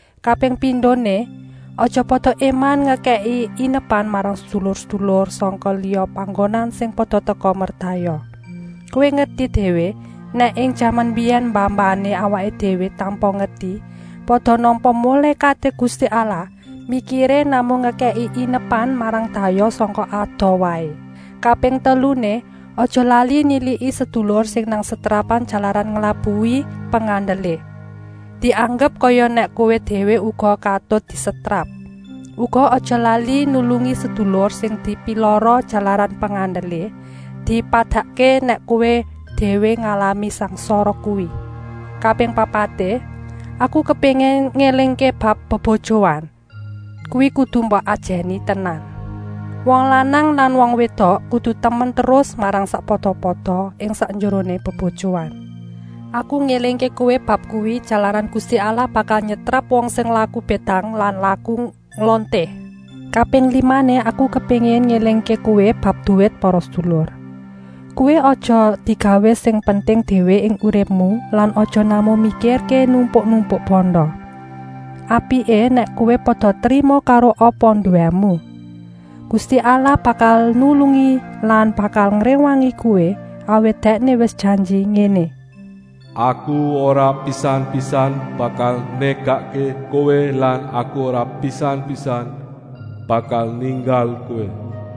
Kaping pindoné, aja pada éman ngekèki inepan marang sedulur-sedulur sangka liya panggonan sing pada teka merdayoh. Kowé ngerti déwé nèk ing jaman mbiyèn mbah-mbahané awaké déwé tanpa ngerti pada nampa mulékaté Gusti Allah, mikiré namung ngekèki inepan marang dayoh sangka adoh waé. Kaping teluné, aja lali niliki sedulur sing nang setrapan jalaran nglabuhi pengandelé. Dianggep kaya nèk kowé déwé uga katut disetrap. Uga aja lali nulungi sedulur sing dipilara jalaran pengandelé, dipadakké nèk kowé déwé ngalami sangsara kuwi. Kaping papaté, aku kepéngin ngélingké bab bebojoan; kuwi kudu mbok ajèni tenan. Wong lanang lan wong wédok kudu temen terus marang sakpada-pada ing sakjeroné bebojoan. Aku ngélingké kowé bab kuwi, jalaran Gusti Allah bakal nyetrap wong sing laku bédang lan laku nglonté. Kaping limané aku kepéngin ngélingké kowé bab duwit para sedulur. Kuwi aja digawé sing penting déwé ing uripmu lan aja namung mikirké numpuk-numpuk banda. Apiké nèk kowé pada trima karo apa nduwému. Gusti Allah bakal nulungi lan bakal ngréwangi kowé, awit Dèkné wis janji ngéné: “Aku ora pisan-pisan bakal négakké kowé lan Aku ora pisan-pisan bakal ninggal kowé.”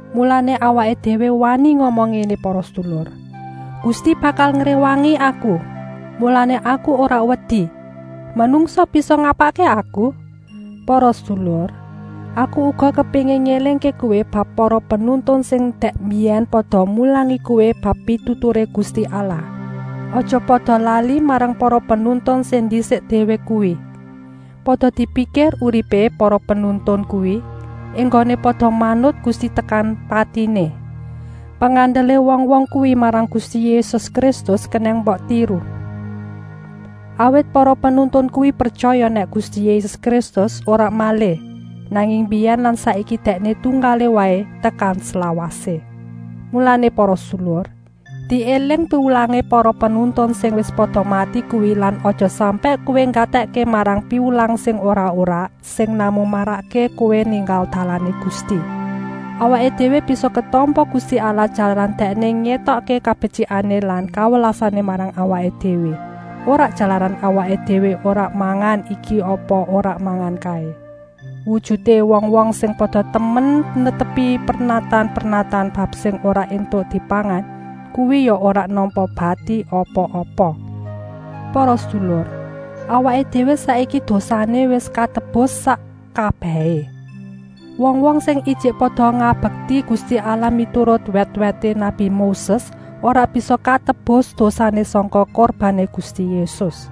Mulané awaké déwé wani ngomong ngéné para sedulur: “Gusti bakal ngréwangi aku, mulané aku ora wedi; manungsa bisa ngapakké aku?” Para sedulur, aku uga kepéngin ngélingké kowé bab para penuntun sing dèk mbiyèn pada mulangi kowé bab pituturé Gusti Allah. Aja pada lali marang para penuntun sing ndisik déwé kuwi. Pada dipikir uripé para penuntun kuwi, enggoné pada manut Gusti tekan patiné. Pengandelé wong-wong kuwi marang Gusti Yésus Kristus kenèng mbok tiru. Awit para penuntun kuwi pretyaya nèk Gusti Yésus Kristus ora malih, nanging mbiyèn lan saiki Dèkné tunggalé waé, tekan slawasé. Mulané para sedulur, diéling piwulangé para penuntun sing wis pada mati kuwi lan aja sampèk kowé nggatèkké marang piwulang sing ora-ora, sing namung marakké kowé ninggal dalané Gusti. Awaké déwé bisa ketampa Gusti Allah jalaran Dèkné ngétokké kabetyikané lan kawelasané marang awaké déwé, ora jalaran awaké déwé ora mangan iki apa ora mangan kaé. Wujuté wong-wong sing pada temen netepi pernatan-pernatan bab sing ora éntuk dipangan kuwi ya ora nampa bati apa-apa. Para sedulur, awaké déwé saiki dosané wis katebus sak kabèhé. Wong-wong sing ijik pada ngabekti Gusti Allah miturut wèt-wèté nabi Moses ora bisa katebus dosané sangka kurbané Gusti Yésus.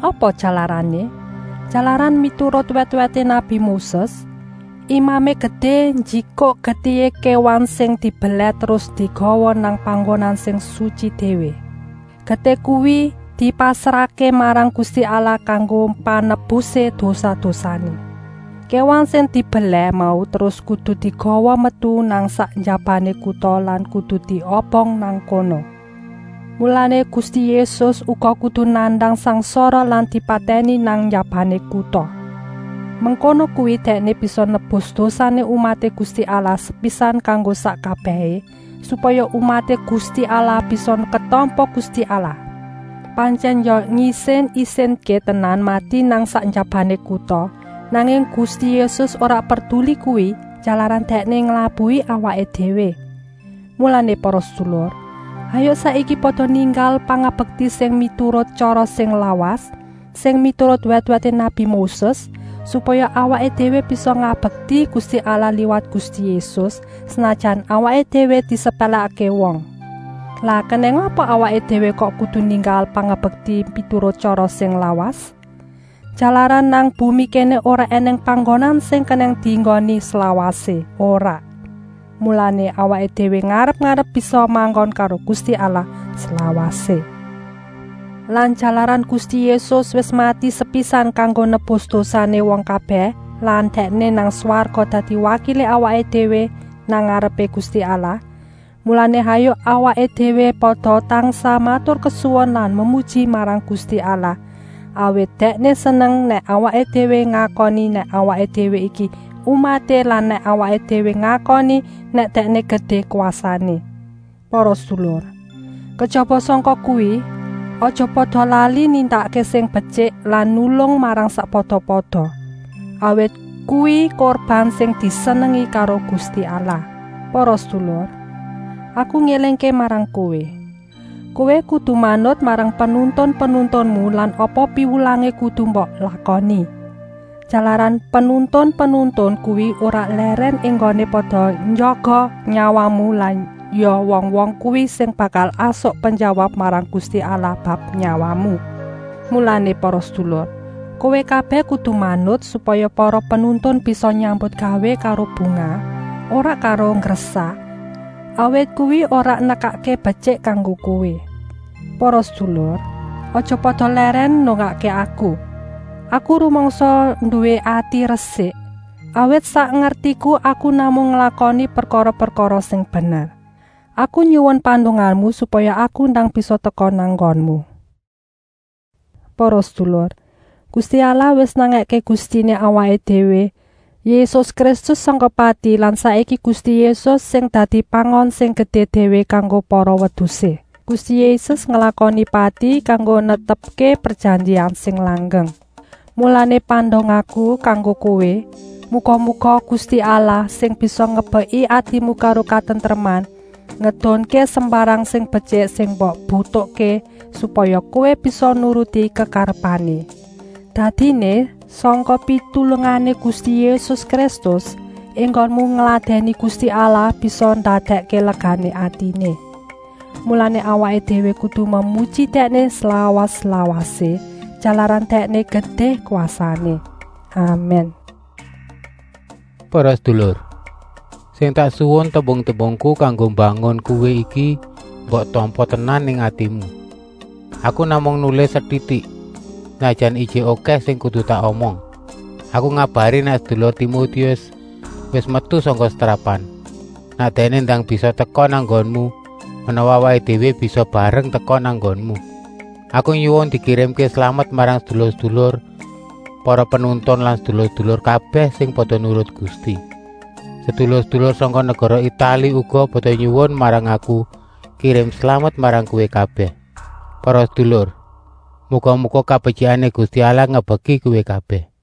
Apa jalarané? Jalaran miturut wèt-wèté nabi Moses, Imamé Gedé njikuk getihé kéwan sing dibelèh terus digawa nang Panggonan Sing Sutyi Déwé. Getih kuwi dipasrahké marang Gusti Allah kanggo panebusé dosa-dosané. Kéwan sing dibelèh mau terus kudu digawa metu nang sak njabané kuta lan kudu diobong nang kono. Mulané Gusti Yésus uga kudu nandang sangsara lan dipatèni nang njabané kuta. Mengkono kuwi Dèkné bisa nebus dosané umaté Gusti Allah sepisan kanggo sak kabèhé, supaya umaté Gusti Allah bisa ketampa Gusti Allah. Pantyèn ya ngisin-isinké tenan mati nang sak njabané kuta, nanging Gusti Yésus ora perduli kuwi, jalaran Dèkné nglabuhi awaké déwé. Mulané para sedulur, hayuk saiki pada ninggal pangabekti sing miturut tyara sing lawas, sing miturut wèt-wèté nabi Moses, supaya awaké déwé bisa ngabekti Gusti Allah liwat Gusti Yésus, senajan awaké déwé disepèlèkké wong. Lah kenèng apa awaké déwé kok kudu ninggal pangabekti miturut tyara sing lawas? Jalaran nang bumi kéné ora ènèng panggonan sing kenèng dienggoni slawasé, ora. Mulané awaké déwé ngarep-arep bisa manggon karo Gusti Allah slawasé. Lan jalaran Gusti Yésus wis mati sepisan kanggo nebus dosané wong kabèh lan Dèkné nang swarga dadi wakilé awaké déwé nang ngarepé Gusti Allah, mulané hayuk awaké déwé pada tansah maturkesuwun lan memuji marang Gusti Allah, awit Dèkné seneng nèk awaké déwé ngakoni nèk awaké déwé iki umaté lan nèk awaké déwé ngakoni nèk Dèkné gedé kwasané. Para sedulur, kejaba sangka kuwi, aja pada lali nindakké sing betyik lan nulung marang sakpada-pada, awit kuwi kurban sing disenengi karo Gusti Allah. Para sedulur, aku ngélingké marang kowé, kowé kudu manut marang penuntun-penuntunmu lan apa piwulangé kudu mbok lakoni. Jalaran penuntun-penuntun kuwi ora lèrèn enggoné pada njaga nyawamu lan ya wong-wong kuwi sing bakal asok penjawab marang Gusti Allah bab nyawamu. Mulané para sedulur, kowé kabèh kudu manut, supaya para penuntun bisa nyambutgawé karo bungah, ora karo nggresah, awit kuwi ora nekakké betyik kanggo kowé. Para sedulur, aja pada lèrèn ndongakké aku. Aku rumangsa nduwé ati resik, awit sak ngertiku aku namung nglakoni prekara-prekara sing bener. Aku nyuwun pandongamu supaya aku ndang bisa teka nang nggonmu. Para sedulur, Gusti Allah wis nangèké Gustiné awaké déwé Yésus Kristus sangka pati lan saiki Gusti Yésus sing dadi Pangon sing gedé déwé kanggo para wedusé. Gusti Yésus nglakoni pati kanggo netepké prejanjian sing langgeng. Mulané pandongaku kanggo kowé, muga-muga Gusti Allah, sing bisa ngebeki atimu karo katentreman, ngedunké sembarang sing betyik sing mbok butuhké, supaya kowé bisa nuruti kekarepané. Dadiné, sangka pitulungané Gusti Yésus Kristus, enggonmu ngladèni Gusti Allah bisa ndadèkké legané atiné. Mulané awaké déwé kudu memuji Dèkné slawas-lawasé, jalaran Dèkné gedé kwasané. Amèn. Para sedulur, sing tak suwun, tembung-tembungku kanggo mbangun kowé iki mbok tampa tenan ing atimu. Aku namung nulis setitik, senajan ijik okèh sing kudu tak omong. Aku ngabari nèk sedulur Timotius wis metu sangka setrapan. Nèk dèkné ndang bisa teka nang nggonku, menawa awaké déwé bisa bareng teka nang nggonmu. Aku nyuwun dikirimké slamet marang sedulur-sedulur para penuntun lan sedulur-sedulur kabèh sing pada nurut Gusti. Sedulur-sedulur sangka negara Itali uga pada nyuwun marang aku kirim slamet marang kowé kabèh. Para sedulur, muga-muga kabetyikané Gusti Allah ngebeki kowé kabèh.